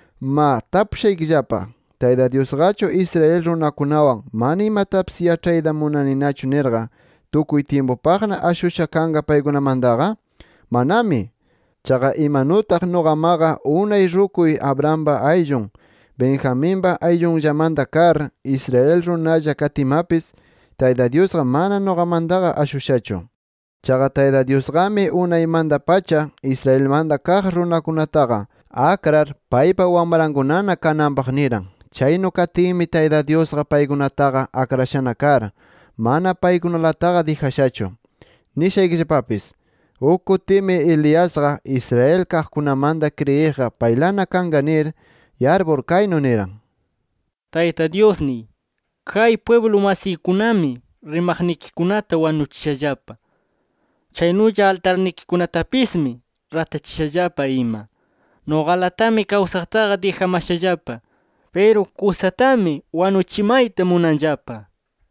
Ma tapushaykillapa: ¿Tayta Dyusqachu Israel runakunawan mana imatapis yaĉhayta munaninachu nirqa, tukuy tyimpupaqna ashusha kanqa paykunamantaqa? ¡Manami! Chaqa imanutaq nuqamaqa unay rukuy Abrahampa ayllun, Benjaminpa ayllunllamanta kar, Israel runalla katiymapis, Tayta Dyusqa mana nuqamantaqa ashushachu. Chaqa Tayta Dyusqami, unaymanta-pacha Israelmanta kaq runakunataqa akrar paypa wamrankunana kananpaq niran. Chaynu katinmi, Tayta Dyusqa paykunataqa akrashana kar, mana paykunalataqa dijashachu. Nishaykillapapis: Uk kutimi Eliasqa, Israel kaqkunamanta kriyiqqa paylana kanqa nir yarpur, kaynu niran: “Tayta Dyusniy, kay pwiblu masiykunami rimaqnikikunata wanuchishallapa. Chaynulla altarnikikunatapismi ratachishallapa ima. Nuqalatami kawsaqtaqa dijamashallapa. Piru kusatami wanuchimayta munanllapa” nir.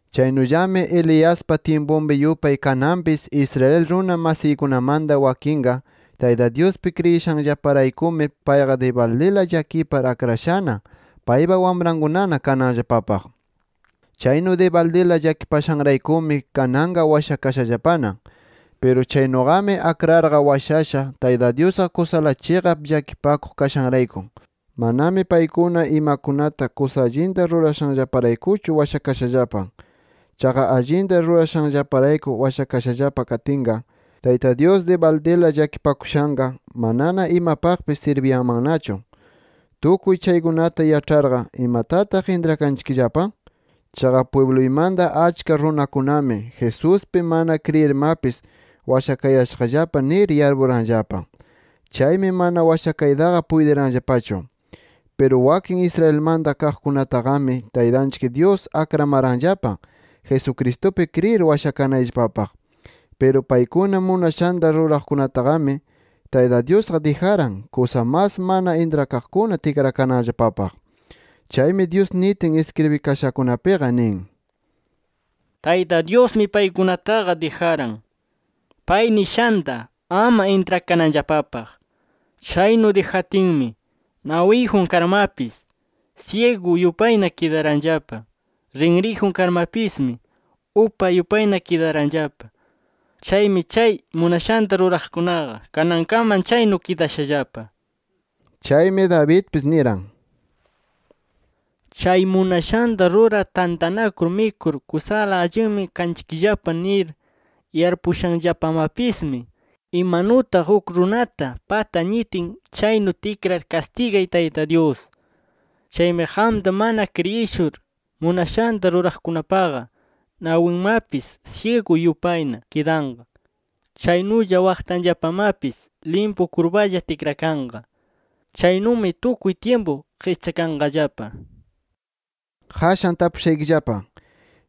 Chaynullami Eliaspa tyimpunpi yupay kananpis Israel runa masiykunamanta wakinqa Tayta Dyuspi kriyishanllaparaykumi payqa dibaldila llakipar akrashana paypa wamrankunana kananllapapaq. Chaynu dibaldila llakipashanraykumi, kananqa washakashallapana. Piru chaynuqami akrarqa washasha Tayta Dyusqa kusala chiqap llakipakuq kashanrayku, manami paykuna imakunata kusa allinta rurashanllaparaykuchu washakashallapa. Chaqa allinta rurashanllaparayku washakashallapa katinqa, Tayta Dyus dibaldila llakipakushanqa manana imapaqpis sirbiyanmannachu. Tukuy chaykunata yaĉharqa, ¿imatataq intrakanchikllapa? Chaqa pwibluymanta achka runakunami Jesuspi mana kriyirmapis washakayashaqllapa nir yarpuranllapa. Chaymi mana washakaytaqa puytiranllapachu. Piru wakin Israelmanta kaqkunataqami Taytanchik Dyus akramaranllapa, Jesucristupi kriyir washakanayllapapaq. Piru paykuna munashanta ruraqkunataqami, Tayta Dyusqa dijaran, kusa mas mana intrakaqkuna tikrakananllapapaq. Chaymi Dyus nitin iskribikashakunapiqa nin: “Tayta Dyusmi paykunataqa dijaran, pay nishanta ama intrakananllapapaq. Chaynu dijatinmi, nawiyjun karmapis, syigu yupayna kidaranllapa. Rinriyjun karmapismi, upa yupayna kidaranllapa. Chaymi chay munashanta ruraqkunaqa kanankaman chaynu kidashallapa” nir. Chaymi Davidpis niran: “Chay munashanta rurar tantanakur mikur kusala allinmi kanchikllapa nir yarpuyashanllapamapismi, imanutaq uk runata pata ñitin chaynu tikrar kastigay Tayta Dyus. Chaymi qamta mana kriyishur munashanta ruraqkunapaqa, nawinmapis syigu yupayna kidanqa. Chaynulla waqtanllapamapis limpu kurpalla tikrakanqa. Chaynumi tukuy tyimpu qischakanqallapa” nir. Qashan tapushaykillapa: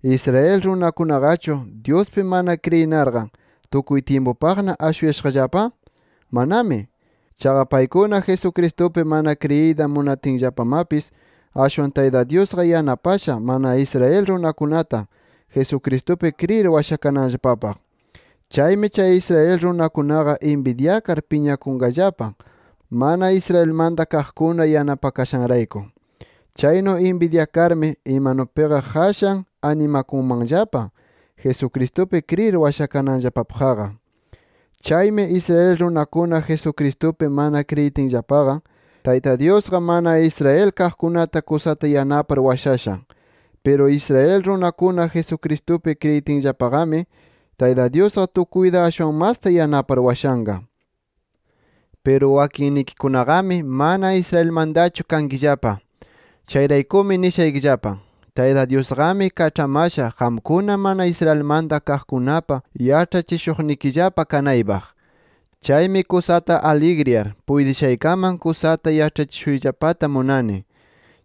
¿Israel runakunaqachu, Dyuspi mana kriyinarqa tukuy tyimpupaqna ashushallapa? ¡Manami! Chaqa paykuna Jesucristupi mana kriyiyta munatinllapamapis, ashwan Tayta Dyusqa yanapasha mana Israel runakunata, Jesucristupi kriyir washakananllapapaq. Chaymi chay Israel runakunaqa inbidyakar piñakunqallapa mana Israelmanta kaqkuna yanapakashanrayku. Chaynu inbidyakarmi, imanupiqa qashan animakunmanllapa, Jesucristupi kriyir washakananllapapaqqa. Chaymi, Israel runakuna Jesucristupi mana kriyitinllapaqa, Tayta Dyusqa mana Israel kaqkunata kusata yanapar washasha. Piru Israel runakuna Jesucristupi kriyitinllapaqami, Tayta Dyusqa tukuyta ashwan masta yanapar washanqa. Piru wakinnikikunaqami mana Israelmantachu kankillapa. Chayraykumi nishaykillapa: Tayta Dyusqami kaĉhamasha qamkuna mana Israelmanta kaqkunapa yaĉhachishuqnikillapa kanaypaq. Chaymi kusata aligriyar, puytishaykaman kusa allita yaĉhachishuyllapata munayani.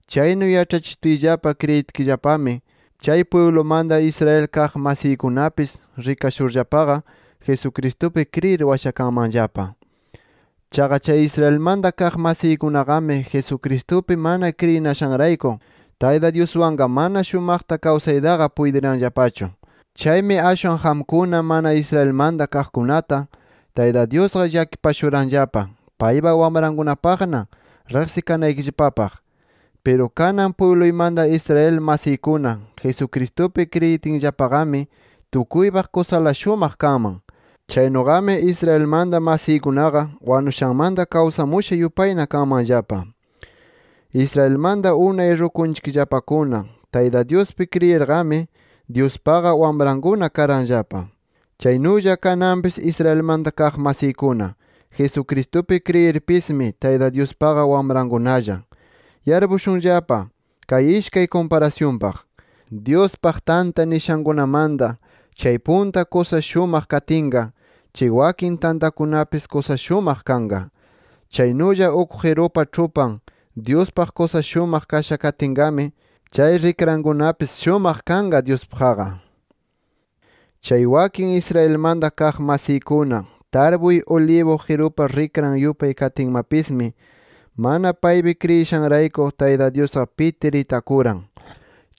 Chaynu yaĉhachishutiyllapa kriyitkillapami, chay pwiblumanta Israel kaq masiykunapis rikashurllapaqa, Jesucristupi kriyir washakanmanllapa. Chaqa Israelmanta kaq masiykunaqami Jesucristupi mana kriyinashanrayku, Tayta Dyuswanqa mana shumaqta kawsaytaqa puytiranllapachu. Chaymi ashwan qamkuna mana Israelmanta kaqkunata Tayta Dyusqa llakipashuranllapa paypa wamrankunapaqna riqsikanaykillapapaq. Piru kanan pwibluymanta Israel masiykuna, Jesucristupi kriyitinllapaqami tukuypaq kusala shumaq kanman. Chaynuqami Israelmanta masiykunaqa wanushanmanta kawsamusha yupayna kanmanllapa. Israelmanta unay rukunchikllapakuna Tayta Dyuspi kriyirqami, Dyuspaqa wamrankuna karanllapa. Chaynulla kananpis Israelmanta kaq masiykuna Jesucristupi kriyirpismi, Tayta Dyuspaqa wamrankunalla. Yarpushunllapa kay ishkay kumparasyunpaq: Dyuspaq tanta nishankunamanta chay punta kaq kusa shumaq katinqa, chay wakin tantakunapis kusa shumaq kanqa. Chaynulla uk qirupa ĉhupan, Dyuspaq kusa shumaq kasha katinqami, chay rikrankunapis shumaq kanqa Dyuspaqqa. Chay wakin Israelmanta kaq masiykuna tarpuy ulibu qirupa rikran yupay katinmapismi, mana paypi kriyishanrayku Tayta Dyusqa pitir itakuran.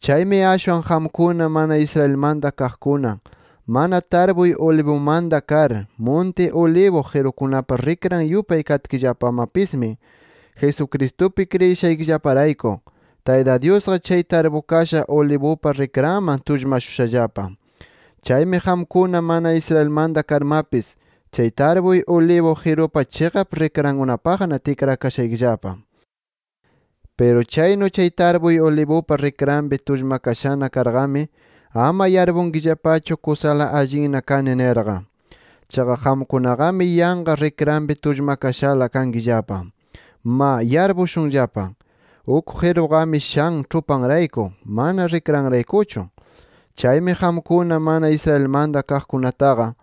Chaymi ashwan qamkuna mana Israelmanta kaqkuna, mana tarpuy ulibumanta kar, munti ulibu qirukunapa rikran yupay katkillapamapismi, Jesucristupi kriyishaykillaparayku, Tayta Dyusqa chay tarpukasha ulibupa rikranman tullmashushallapa. Chaymi qamkuna mana Israelmanta karmapis, chay tarpuy ulibu qirupa chiqap rikrankunapaqna tikrakashaykillapa. Piru chaynu chay tarpuy ulibupa rikranpi tullmakashana karqami, ama yarpunkillapachu kusala allinna kani nirqa. Chaqa qamkunaqami yanqa rikranpi tullmakashala kankillapa. Ma yarpushunllapa, uk qiruqami shan ĉhupanrayku, mana rikranraykuchu. Chaymi qamkuna mana Israelmanta kaqkunataqa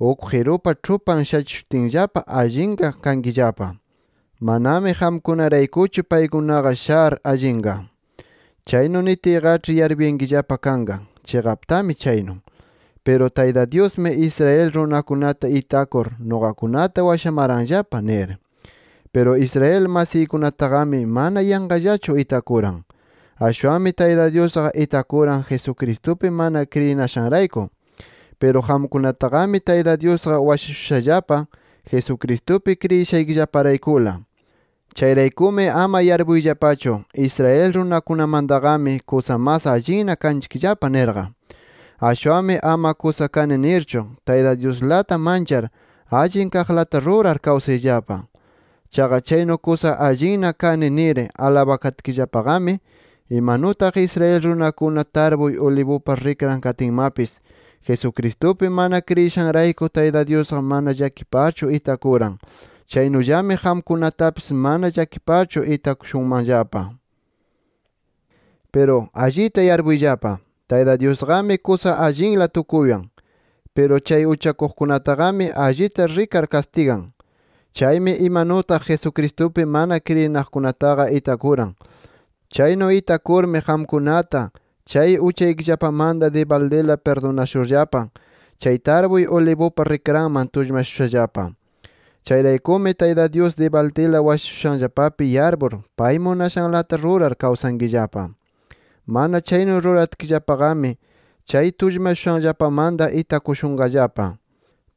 uk qirupa ĉhupan shachishutinllapa allinqa kankillapa. Manami qamkunaraykuchu paykunaqa shar allinqa. Chaynu nitiyqaĉhi yarpuyankillapa kanqa: “Chiqaptami chaynu. Piru Tayta Dyusmi, Israel runakunata itakur, nuqakunata washamaranllapa” nir. Piru Israel masiykunataqami mana yanqallachu itakuran. Ashwanmi Tayta Dyusqa itakuran Jesucristupi mana kriyinashanrayku. Piru qamkunataqami Tayta Dyusqa washashushallapa, Jesucristupi kriyishaykillaparaykula. Chayraykumi ama yarpuyllapachu Israel runakunamantaqami kusa mas allinna kanchikllapa nirqa. Ashwanmi ama kusa kani nirchu Tayta Dyuslata manchar, allin kaqlata rurar kawsayllapa. Chaqa chaynu kusa allinna kani nir alabakatkillapaqami, imanutaq Israel runakuna tarpuy ulibupa rikran katinmapis, Jesucristupi mana kriyishanrayku Tayta Dyusqa mana llakiparchu itakuran, chaynullami qamkunatapis mana llakiparchu itakushunmanllapa. Piru ¡allita yarpuyllapa! Tayta Dyusqami kusa allinla tukuywan. Piru chay uchakuqkunataqami allita rikar kastigan. Chaymi imanutaq Jesucristupi mana kriyinaqkunataqa itakuran. Chaynu itakurmi, qamkunata chay uchaykillapamanta dibaldila pirdunashurllapa, chay tarpuy ulibupa rikranman tullmashushallapa. Chayraykumi Tayta Dyus dibaldila washashushanllapapi yarpur pay munashanlata rurar kawsankillapa. Mana chaynu ruratkillapaqami chay tullmashushanllapamanta itakushunqallapa.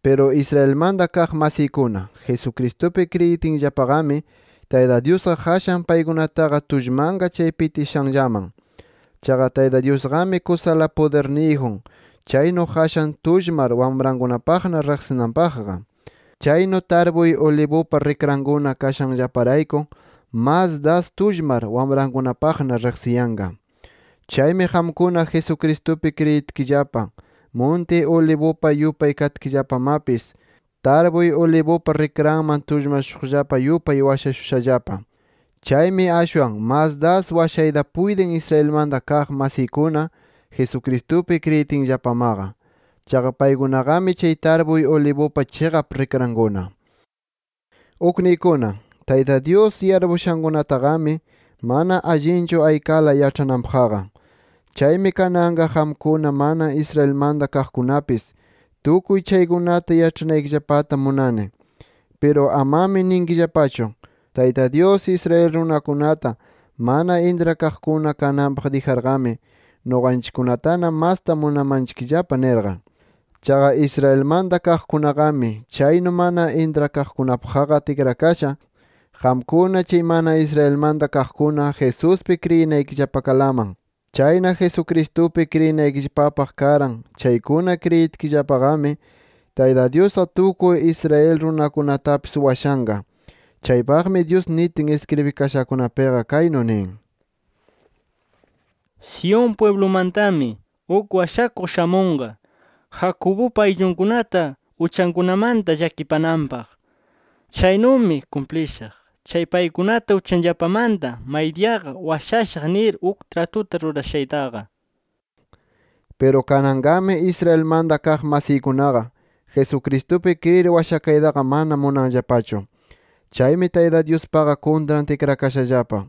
Piru Israelmanta kaq masiykuna Jesucristupi kriyitinllapaqami, Tayta Dyusqa qashan paykunataqa tullmanqa chay pitishanllaman. Chaqa Tayta Dyusqami kusala pudirniyjun chaynu qashan tullmar wamrankunapaqna riqsinanpaqqa. Chaynu tarpuy ulibupa rikrankuna kashanllaparayku, mas das tullmar wamrankunapaqna riqsiyanqa. Chaymi qamkuna, Jesucristupi kriyitkillapa, munti ulibupa yupay katkillapamapis, tarpuy ulibupa rikranman tullmashuqllapa yupay washashushallapa. Chaymi ashwan mas das washayta puytin Israelmanta kaq masiykuna, Jesucristupi kriyitinllapamaqa. Chaqa paykunaqami chay tarpuy ulibupa chiqap rikrankuna. Ukniykuna, Tayta Dyus yarpuyashankunataqami, mana allinchu aykala yaĉhananpaqqa. Chaymi kananqa qamkuna mana Israelmanta kaqkunapis, tukuy chaykunata yaĉhanaykillapata munani. Piru amami ninkillapachu: “Tayta Dyus, Israel runakunata mana intrakaqkuna kananpaq dijarqami, nuqanchikkunatana masta munamanchikllapa” nirqa. Chaqa Israelmanta kaqkunaqami chaynu mana intrakaqkunapaqqa tikrakasha, qamkuna chay mana Israelmanta kaqkuna, Jesuspi kriyinaykillapakalaman. Chayna Jesucristupi kriyinaykillapapaq karan chaykuna kriyitkillapanaqami, Tayta Dyusqa tukuy Israel runakunatapis washanqa. Chaypaqmi Dyus nitin iskribikashakunapiqa kaynu nin: “Sión pwiblumantami uk washakuq shamunqa, Jacobupa ayllunkunata uchankunamanta llakipananpaq. Chaynumi kumplishaq chay paykunata uchanllapamanta maydiyaqa washayashaq nir uk tratuta rurashaytaqa”. Piru kananqami Israelmanta kaq masiykunaqa, Jesucristupi kriyir washakaytaqa mana munanllapachu. Chaymi Tayta Dyuspaqa kuntran tikrakashallapa.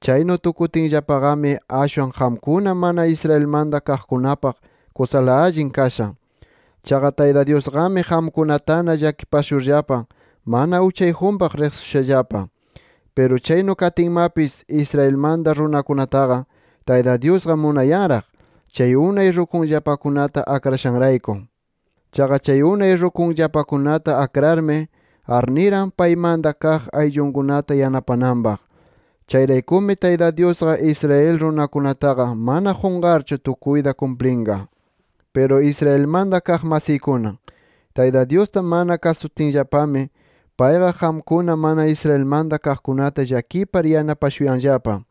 Chaynu tukutinllapaqami ashwan qamkuna mana Israelmanta kaqkunapaq kusala allin kasha. Chaqa Tayta Dyusqami qamkunatana llakipashurllapa mana uchayjunpaq riqsishushallapa. Piru chaynu katinmapis, Israel runakunataqa Tayta Dyusqa munayanraq, chay unay rukuyllapakunata akrashanrayku. Chaqa chay unay rukuyllapakunata akrarmi, arniran paymanta kaq ayllunkunata yanapananpaq. Chayraykumi Tayta Dyusqa, Israel runakunataqa mana qunqarchu tukuyta kumplinqa. Piru Israelmanta kaq masiykuna Tayta Dyusta mana kasutinllapami, payqa qamkuna mana Israelmanta kaqkunata llakipar yanapashuyanllapa.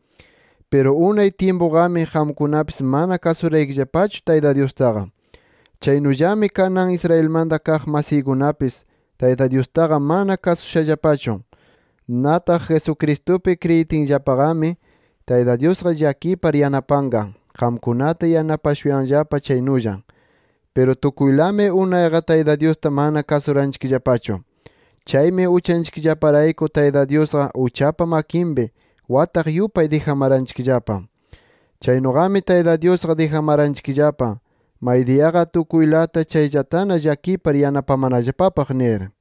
Piru unay tyimpuqami qamkunapis mana kasuraykillapachu Tayta Dyustaqa. Chaynullami kanan, Israelmanta kaq masiykunapis Tayta Dyustaqa mana kasushallapachu. Nataq Jesucristupi kriyitinllapaqami, Tayta Dyusqa llakipar yanapanqa, qamkunata yanapashuyanllapa chaynulla. Piru tukuylami unayqa Tayta Dyusta mana kasuranchikllapachu. Chaymi uchanchikllaparayku Tayta Dyusqa uchapa makinpi wataq yupay dijamaranchikllapa. Chaynuqami Tayta Dyusqa dijamaranchikllapa, maydiyaqa tukuylata chayllatana llakipar yanapamanallapapaq nir.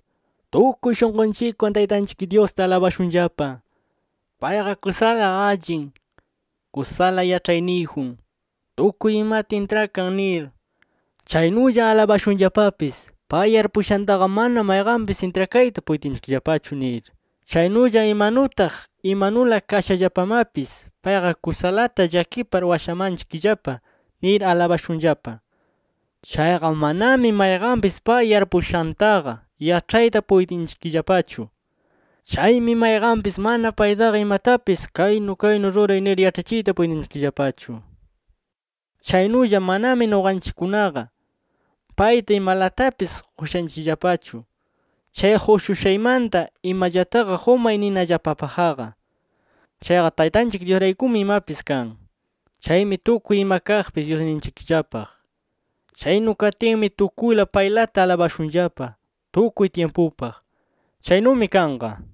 ¡Tukuy shunqunchikwan Taytanchik Dyusta alabashunllapa! Payqa kusala allin, kusala yaĉhayniyjun, tukuy imata intrakan nir. Chaynulla alabashunllapapis pay yarpushantaqa mana mayqanpis intrakayta puytinchikllapachu nir, chaynulla imanutaq imanula kashallapamapis payqa kusalata llakipar washamanchikllapa nir alabashunllapa. Chaqa manami mayqanpis pay yarpuyashantaqa yaĉhayta puytinchikllapachu. Chaymi mayqanpis mana paytaqa imatapis kaynu kaynu ruray nir yaĉhachiyta puytinchikllapachu. Chaynulla manami nuqanchikkunaqa payta imalatapis qushanchikllapachu, chay qushushaymanta imallataqa qumay ninallapapaqqa. Chaqa Taytanchik Dyusraykumi imapis kan. Chaymi tukuy ima kaqpis Dyusninchikllapaq. ¡Chaynu katinmi tukuyla paylata alabashunllapa tukuy tyimpupaq! Chaynumi kanqa.